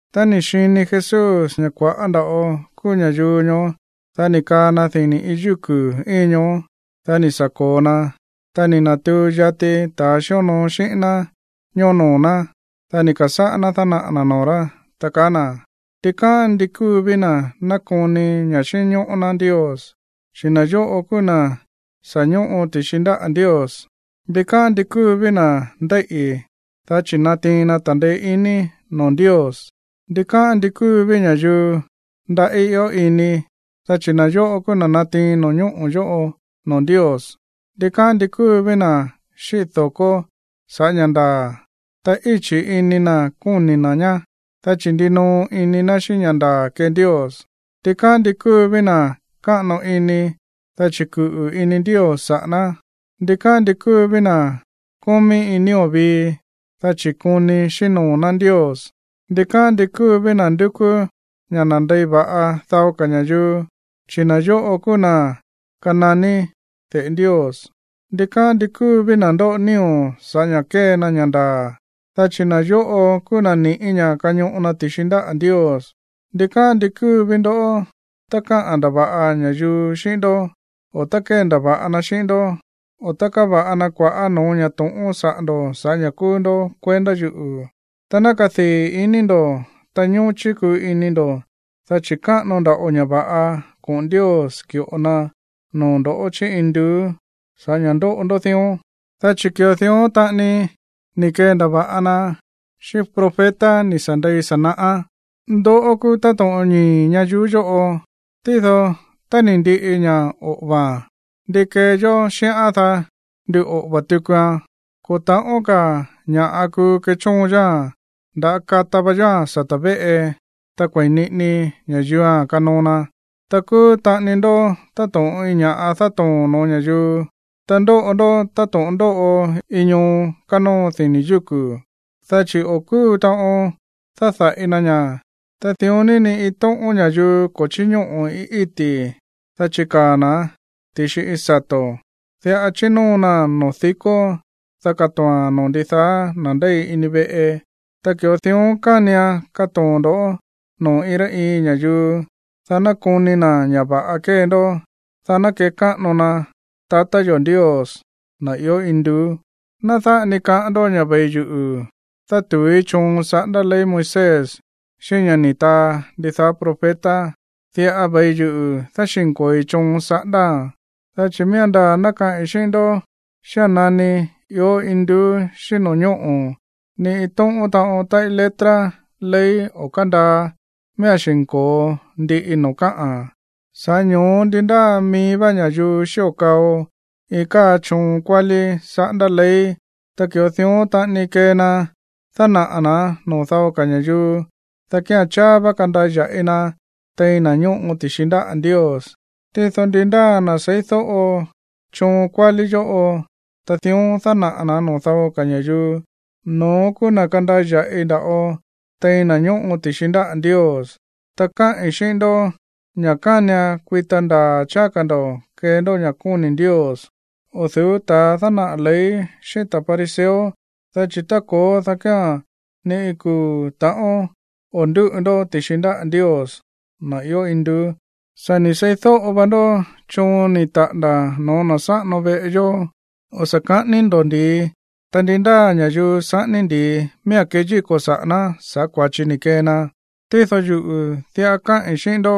Tá ni̱ xini Jesús ña̱ kua̱ꞌá nda̱ꞌo kúú ña̱yuu ñoó, dá ni̱ kaa na dini̱ iin yúku̱ íin ñoó. Dá ni̱ sa̱ ko̱o na. Ta ni̱ na̱tuu yati ta̱a xíonoo xíꞌín ná ñoó noo̱ ná. Dá ni̱ ka̱sáꞌá ná dánaꞌa̱ na̱ noo̱ rá, ta kaá na̱: ―Ndikáꞌán ndi kúu ví na̱ nákoni ña̱ xínñóꞌó ná Ndios, chi̱ na̱ yóꞌo kúú na̱ sa̱ ñóꞌo ti̱xi ndáꞌa̱ Ndios. ’Ndikáꞌán ndi kúu ví na̱ ndéíꞌi̱, dá chi̱ natiin na ta̱ndeé iní noo̱ Ndios. ’Ndikáꞌán ndi kúu ví ña̱yuu ndaꞌí ió ini, dá chi̱ na̱ yóꞌo kúú na̱ natiin no̱ñóꞌo̱ yóꞌo noo̱ Ndios. ’Ndikáꞌán ndi kúu ví na̱ xíꞌi̱ do̱ko sa̱ꞌá ña̱ ndaa̱, ta íchi̱ ini na̱ koni na̱ ñá, dá chi̱ ndinoo ini na̱ xíꞌín ña̱ ndaa̱ kee Ndios. ’Ndikáꞌán ndi kúu ví na̱ káꞌano ini, dá chi̱ kuꞌu̱ ini Ndios saꞌa̱ ná. ’Ndikáꞌán ndi kúu ví na̱ kómí iin nío̱ vii, dá chi̱ koni xíꞌín noo̱ ná Ndios. ’Ndikáꞌán ndi kúu ví na̱ ndúkú ña̱ nandei va̱ꞌa dao ka̱ ña̱yuu, dá chi̱ na̱ yóꞌo kúú na̱ kananí de̱ꞌe Ndios. ’Ndikáꞌán ndi kúu ví na̱ ndóꞌo nío̱ sa̱ꞌá ña̱ kée na ña̱ ndaa̱, dá chi̱ na̱ yóꞌo kúú na̱ ni̱ꞌí ña̱ kañoꞌo na ti̱xi ndáꞌa̱ Ndios. ’Ndikáꞌán ndi kúu ví ndoꞌó tá káꞌa̱n ndava̱ꞌa ña̱yuu xíꞌín ndó, o tá kéndava̱ꞌa na xíꞌín ndó, o tá káva̱ꞌa na kua̱ꞌá no̱ó ña̱ to̱ꞌón saꞌa̱ ndo̱ sa̱ꞌá ña̱ kúú ndó kuendá yuꞌu̱. Ta ná kadii̱ iní ndo̱, ta ñóchí kuu ini ndo̱, dá chi̱ káꞌano nda̱ꞌo ña̱ va̱ꞌa koꞌo̱n Ndios ki̱ꞌo na noo̱ ndo̱ chí induú sa̱ꞌá ña̱ ndóꞌo ndó dión, dá chi̱ ki̱ꞌo dión taꞌani ni̱ kendava̱ꞌa na xíꞌín profeta ni̱ sa̱ ndei sa̱ naꞌá. ’Ndoꞌó kúú táto̱ꞌon ñii̱ ñayuú yóꞌo, tído tá ni̱ ndiꞌi ña̱ oꞌo̱va̱a̱n, ¿ndi kee yó xíꞌán, dá nduꞌoꞌo̱va̱ tukuan? Ko̱ ta̱ꞌón ka̱ ña̱ꞌa kuu kechóon yóa̱n. Ndá kata va yóa̱n sata̱ véꞌe, ta kue̱i niꞌini ña̱yuua̱n kanoo na. ’Ta kúú taꞌani ndó táto̱ꞌon iin ña̱ꞌa dátoo̱n no̱ó ña̱yuu, ta ndóꞌo ndó táto̱ꞌon ndóꞌo iin ñoo kánóo dini̱ yúku̱, dá chi̱ o̱ kúu taꞌon dáda̱ꞌi na ña̱. Ta dión ní, ni iin tóꞌón ña̱yuu ko̱ chíñóꞌo̱ iin íti̱, dá chikaa̱ na̱án ti̱xi iin sato̱. Diꞌa chínóo naa̱n noo̱ dikó, dá katoo̱a̱n noo̱ ndidaá na̱ ndéi ini veꞌe. Ta ki̱ꞌo dión kánian katoo̱n ndo̱ noo̱ iin rá iin ña̱yuu, dá ná koni na̱ ña̱ va̱ꞌa kée ndó, dá ná kekáꞌano na tatá yo̱ Ndios, na̱ ió induú. ’Ná dáꞌa ni kaꞌán ndó ña̱ ve̱i yuꞌu̱ dátu̱úí choon saꞌándá ley Moisés xíꞌín ña̱ ni̱ taa ndidaá profeta. Diꞌa ve̱i yuꞌu̱ dáxi̱nko̱oi choon saꞌándáa̱n. Dá chi̱ miía̱n ndaa̱ ná kaꞌi̱n xíꞌín ndó ña̱ xía̱n nani ió induú xíꞌín no̱ñóꞌo̱, ni iin tóꞌón taꞌon táꞌí letra ley o̱ kándaa, miía̱n xi̱nko̱o ndiꞌi noo̱ káꞌa̱n. Sa̱ꞌá ño̱ó, ndi ndáa mií vá ña̱yuu xío kao iin káa choon kuálí saꞌándá ley, ta ki̱ꞌo dión taꞌani kee na dánaꞌa̱ na̱án noo̱ dao ka̱ ña̱yuu, dá kía̱n cháá vá kandaya̱ꞌi na tein na̱ ñóꞌo ti̱xi ndáꞌa̱ Ndios. Tído ndi ndáa na̱ seídóꞌo choon kuálí yóꞌo, ta dión dánaꞌa̱ na̱ noo̱ dao ka̱ ña̱yuu, no̱ón kúú na̱ kandaya̱ꞌi nda̱ꞌo tein na̱ ñóꞌo ti̱xi ndáꞌa̱ Ndios. Ta káꞌi̱n xíꞌín ndó ña̱ kánian kuita ndaa̱ cháá ka̱ ndo̱ kee ndó ña̱ kóni̱ Ndios o̱ du̱ú ta̱ dánaꞌa̱ ley xíꞌín ta̱ fariseo, dá chi̱ tá ko̱ó, dá kía̱n ni iin kuu̱ ta̱ꞌón o̱ ndúꞌu ndó ti̱xi ndáꞌa̱ Ndios, na̱ ió induú. ’Sa̱ ni̱ seídóꞌo va ndó choon ni̱ taꞌa̱nda̱ no̱ó na̱ sáꞌano veꞌe yó: “O̱ sa̱ ka̱ꞌání ndó ndi̱i, ta ndi ndáa ña̱yuu saꞌání ndi̱i, miía̱n keyíko̱ saꞌa̱ ná sa̱ꞌá kua̱chi ni̱ kee na.” Tído yuꞌu̱ diꞌa káꞌi̱n xíꞌín ndó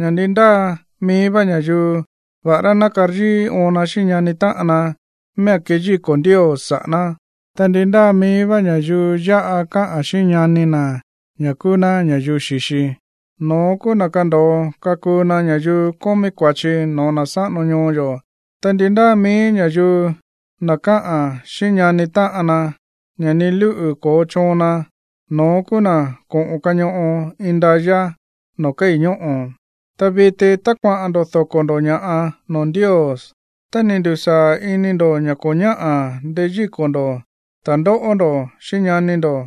ña̱ ndi ndáa mií vá ña̱yuu, va̱ꞌará ná karyíí óon na xíꞌín ñani táꞌan na, miía̱n keyíko̱ Ndios saꞌa̱ ná. Ta ndi ndáa mií vá ña̱yuu yáꞌa káꞌa̱n xíꞌín ñani na̱ ña̱ kúú ná ña̱yuu xi̱xi, no̱ón kúú na̱ kando̱o kakuu na ña̱yuu kómí kua̱chi no̱ó na̱ sáꞌano ñoo yo̱. Ta ndi ndáa mií ña̱yuu, na̱ káꞌa̱n xíꞌín ñani táꞌan na ña̱ ni lúꞌu̱ ko̱ chóon na, no̱ón kúú na̱ koꞌo̱n kañoꞌo indayá noo̱ kéi̱ ñóꞌo̱. ’Ta viti, tá kuaꞌa̱n ndo̱ doko̱ ndo̱ ña̱ꞌa noo̱ Ndios, ta ni̱ ndu̱sáa̱ ini ndo̱ ña̱ ko̱ ñáꞌa̱ ndeyíko̱ ndo̱ ta̱ndóꞌó ndo̱ xíꞌín ñani ndo̱,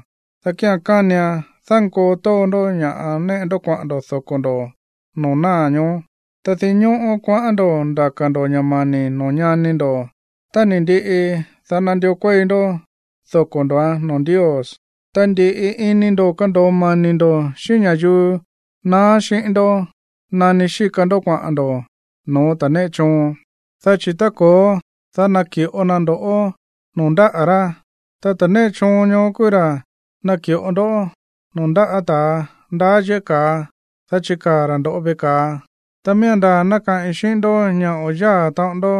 dá kía̱n kánian dánkoo tóo ndó ña̱ néꞌe ndó kuaꞌa̱n ndo̱ doko̱ ndo̱ noo̱ náa̱ ñoó, ta dinñóꞌó kuaꞌán ndo̱ ndaka̱ ndo̱ ña̱ mani̱ noo̱ ñani ndo̱. Tá ni̱ ndiꞌi, dá nandió kuéi ndó doko̱ ndo̱án noo̱ Ndios. Ta ndi̱ꞌi ini ndo̱ kando̱o mani̱ ndo̱ xíꞌín ña̱yuu naá xíꞌín ndó nani xíka ndó kuaꞌa̱n ndo̱ no̱ó ta̱ néꞌe choon. Dá chi̱ tá ko̱ó, dá naki̱ꞌo na ndo̱ꞌó noo̱ ndáꞌa̱ rá. Ta ta̱ néꞌe choon ñoó kúú ra̱ naki̱ꞌo ndoꞌó noo̱ ndáꞌa̱ ta̱ ndaá yéꞌé ka̱a, dá chikaa̱ ra̱ ndo̱ꞌó veꞌe ka̱a. Tá miía̱n ndaa̱ ná kaꞌi̱n xíꞌín ndó ña̱ o̱ yáa̱ taꞌon ndó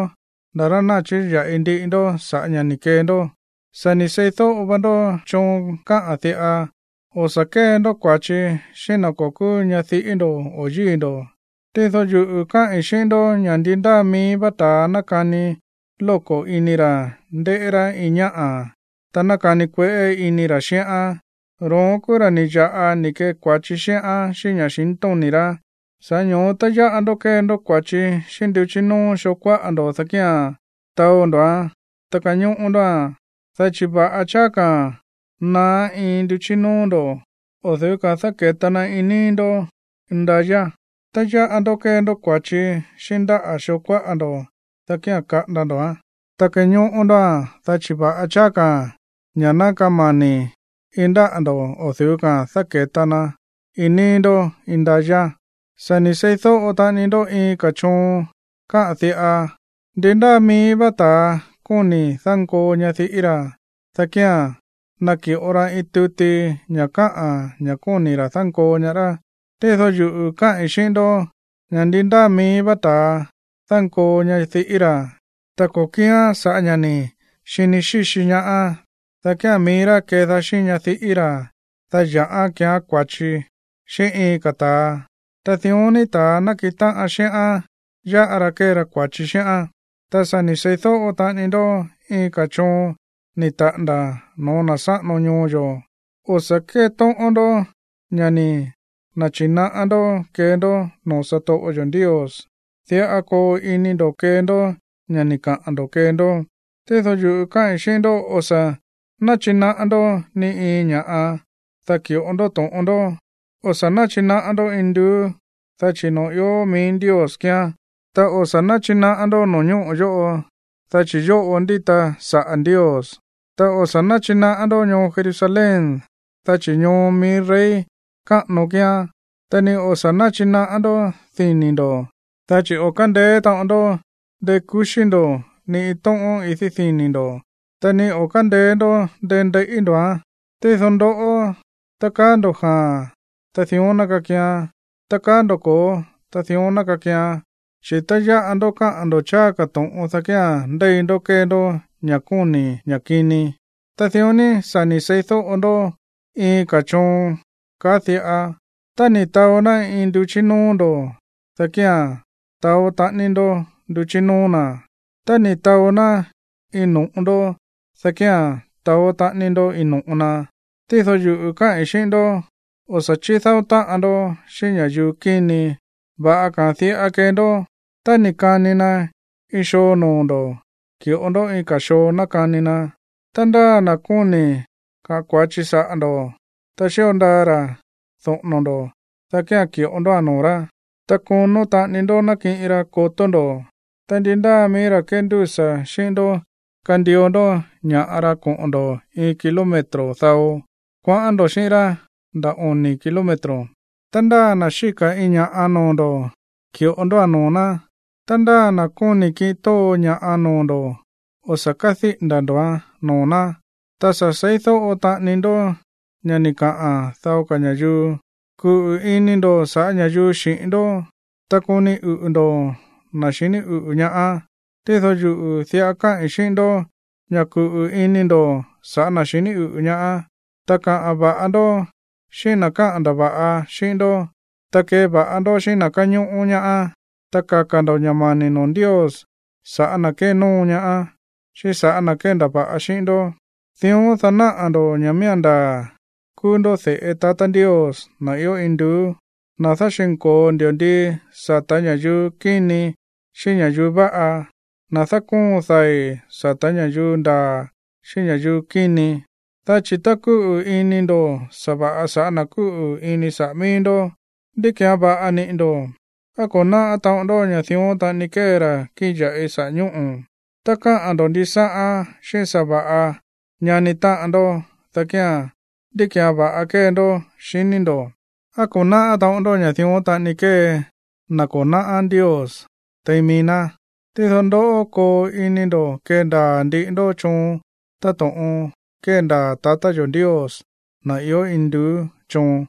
nda̱ rá ná chiya̱ꞌi ndiꞌi ndó sa̱ꞌá ña̱ ni̱ kee ndó. ’Sa̱ ni̱ seídóꞌo va ndó choon kaá diꞌa: “O̱ sa̱ kée ndó kua̱chi xíꞌín na̱ ko̱ kúú ñadiꞌí ndo̱ o yíi̱ ndo̱.” Tído yuꞌu̱ káꞌi̱n xíꞌín ndó ña̱ ndi ndáa mií vá ta̱a nákani lóko̱ ini ra̱ ndéꞌé rá iin ñáꞌa̱, ta nákani kueꞌé ini ra̱ xíꞌán, ro̱ón kúú ra̱ ni̱ ya̱ꞌa ni̱ kee kua̱chi xíꞌán xíꞌín ña̱xintóni̱ rá. ’Sa̱ꞌá ño̱ó, tá yáꞌa ndó kée ndó kua̱chi xíꞌín nduchí nóó xoo kuáꞌa ndo̱, dá kía̱n taó ndo̱án, ta kañóꞌó ndóa̱n. Dá chi̱ va̱ꞌa cháá ka̱a̱n ná naá iin nduchí nóó ndo̱ o̱ du̱ú ka̱a̱n dáke̱ta na iin níí ndó indayá. Tá yáꞌa ndó kée ndó kua̱chi xíꞌín ndáꞌa̱ xoo kuáꞌa ndo̱, dá kía̱n kaꞌanda ndo̱án, ta kañóꞌó ndóa̱n. Dá chi̱ va̱ꞌa cháá ka̱ ña̱ ná kamani̱ iin ndáꞌa̱ ndo̱ o̱ du̱ú ka̱a̱n dáke̱ta na iin níí ndó indayá. ’Sa̱ ni̱ seídóꞌo taꞌani ndó iin ka̱ choon kaá diꞌa: “Ndi ndáa mií vá ta̱a kóni̱ dánkoo ñadiꞌí ra̱, dá kía̱n naki̱ꞌo ra iin tuti ña̱ káꞌa̱n ña̱ kóni̱ ra̱ dánkoo ñaá rá.” Tído yuꞌu̱ káꞌi̱n xíꞌín ndó ña̱ ndi ndáa mií vá ta̱a dánkoo ñadiꞌí ra̱, ta ko̱ kíán sa̱ꞌá ña̱ ni̱ xini xíxi ñaá, dá kía̱n mií rá kedaá xíꞌín ñadiꞌí ra̱, dá ya̱ꞌán keeán kua̱chi xíꞌín iin ka̱ ta̱a. Ta dión ní ta̱a nákiꞌin táꞌan xíꞌán, yáꞌa ra kee ra kua̱chi xíꞌán. ’Ta sa̱ ni̱ seídóꞌo taꞌani ndó iin ka̱ choon ni̱ taꞌa̱nda̱ no̱ó na̱ sáꞌano ñoo yo̱: “O̱ sa̱ kétóꞌón ndó ña̱ ni̱ na̱chi̱naꞌá ndó kee ndó noo̱ satoꞌo yo̱ Ndios. Diꞌa koo ini ndo̱ kee ndó ña̱ ni̱ kaa ndo̱ kee ndó.” Tído yuꞌu̱ káꞌi̱n xíꞌín ndó, o̱ sa̱ náchinaꞌá ndó ni iin ña̱ꞌa, dá ki̱ꞌo ndó to̱ꞌon ndó. O̱ sa̱ náchinaꞌá ndó induú, dá chi̱ noo̱ ió mií Ndios kíán, ta o̱ sa̱ náchinaꞌá ndó no̱ñóꞌo̱ yóꞌo, dá chi̱ yóꞌo ndíta saꞌa̱ Ndios, ta o̱ sa̱ náchinaꞌá ndó ñoo Jerusalén, dá chi̱ ñoo mií rey káꞌano kíán. Ta ni o̱ sa̱ náchinaꞌá ndó dini̱ ndo̱, dá chi̱ o̱ kándeé taꞌon ndó ndekuxí ndo̱ ni iin tóꞌón idí dini̱ ndo̱, ta ni o̱ kándeé ndó ndendeiꞌí ndo̱án. Tído ndoꞌó, tá kaa ndo̱ jaa̱n, ta dión ná kakian. Tá kaa ndo̱ ko̱ó, ta dión ná kakian. Chi̱ tá yáꞌa ndó káꞌa̱n ndo̱ cháá ka̱ to̱ꞌon, dá kía̱n ndéi ndó kée ndó ña̱ kóni̱ ña̱ kini. ’Ta dión ní sa̱ ni̱ seídóꞌo ndó iin ka̱ choon kaá diꞌa: “Tá ni̱ taó ná iin nduchí nóó ndo̱, dá kía̱n taó taꞌani ndó nduchí nóó na̱. Tá ni̱ taó ná iin no̱ꞌo ndó, dá kía̱n taó taꞌani ndó iin no̱ꞌo na.” Tído yuꞌu̱ káꞌi̱n xíꞌín ndó, o̱ sa̱ chídáó táꞌan ndó xíꞌín ña̱yuu kíni. Va̱ꞌa ka̱a̱n diꞌa kee ndó: Tá ni̱ kani na iin xoo noo̱ ndo̱, ki̱ꞌo ndó iin ka̱ xoo ná kani na. Ta ndáa na̱ kóni̱ kaꞌa̱n kua̱chi saꞌa̱ ndo̱, ta xío ndaa ra̱ doꞌo̱no̱ ndo̱, dá kía̱n ki̱ꞌo ndóa̱n noo̱ rá, ta konó taꞌani ndó nakiꞌin ra kotó ndo̱. Ta ndi ndáa mií ra̱ kéndúsa̱ xíꞌín ndó kandio ndó ña̱ꞌa ra koꞌo̱n ndo̱ iin kilómetro dao, kuaꞌán ndo̱ xíꞌín rá nda̱ oni̱ kilómetro. Ta ndáa na̱ xíka̱ iin ña̱ꞌa noo̱ ndo̱, ki̱ꞌo ndóa̱n noo̱ ná. Ta ndáa na̱ kóni̱ kiꞌin tóo ña̱ꞌa noo̱ ndo̱, o̱ sa̱ kádíꞌi̱nda̱ ndo̱án noo̱ ná. ’Ta sa̱ seídóꞌo taꞌani ndó ña̱ ni̱ kaꞌa̱n dao ka̱ ña̱yuu: “Kuꞌu̱ ini ndo̱ saꞌa̱ ña̱yuu xi̱ꞌín ndó, ta koni uꞌu̱ ndo̱ na̱ xiní uꞌu̱ ñaá.” Tído yuꞌu̱ diꞌa káꞌi̱n xíꞌín ndó ña̱ kuꞌu̱ ini ndo̱ sa̱ꞌá na̱ xiní uꞌu̱ ñaá, ta kaꞌa̱n va̱ꞌa ndó xíꞌín na̱ káꞌa̱n ndava̱ꞌa xíꞌín ndó, ta keva̱ꞌa ndó xíꞌín na̱ káñóꞌó ñaá, ta kaka̱ ndo̱ ña̱ mani̱ noo̱ Ndios sa̱ꞌá na̱ kénóo ñaá, xíꞌín sa̱ꞌá na̱ kéndava̱ꞌa xíꞌín ndó. Dión, dá náꞌa̱ ndo̱ ña̱ miía̱n ndaa̱ kúú ndó de̱ꞌe tatá Ndios, na̱ ió induú, na̱ dáxi̱nko̱o ndi̱ndii sata̱ ña̱yuu kíni xíꞌín ña̱yuu váꞌa, na̱ dákóon dai̱ sata̱ ña̱yuu ndaa̱, xíꞌín ña̱yuu kíni. Dá chi̱ tá kúꞌu̱ ini ndo̱ sa̱va̱ꞌa sa̱ꞌá na̱ kúꞌu̱ ini saꞌa̱ mií ndó, ¿ndí ki̱án va̱ꞌa niꞌi̱ ndo̱? ¿Á ko̱ náꞌá taꞌon ndó ña̱ dión taꞌani kée ra̱ kíꞌin ya̱ꞌi saꞌa̱ ñóꞌo̱? Tá káꞌa̱n ndo̱ ndisáꞌán xíꞌín sa̱va̱ꞌa ñani táꞌan ndó, dá kía̱n, ¿ndí ki̱án va̱ꞌa kée ndó, xiní ndo̱? ¿Á ko̱ náꞌá taꞌon ndó ña̱ dión taꞌani kée na̱ ko̱ náꞌá Ndios tein mií ná? Tído ndoꞌó, koo ini ndo̱ kendaa̱ ndiꞌi ndó choon táto̱ꞌon kéndaa̱ tatá yo̱ Ndios, na̱ ió induú, choon.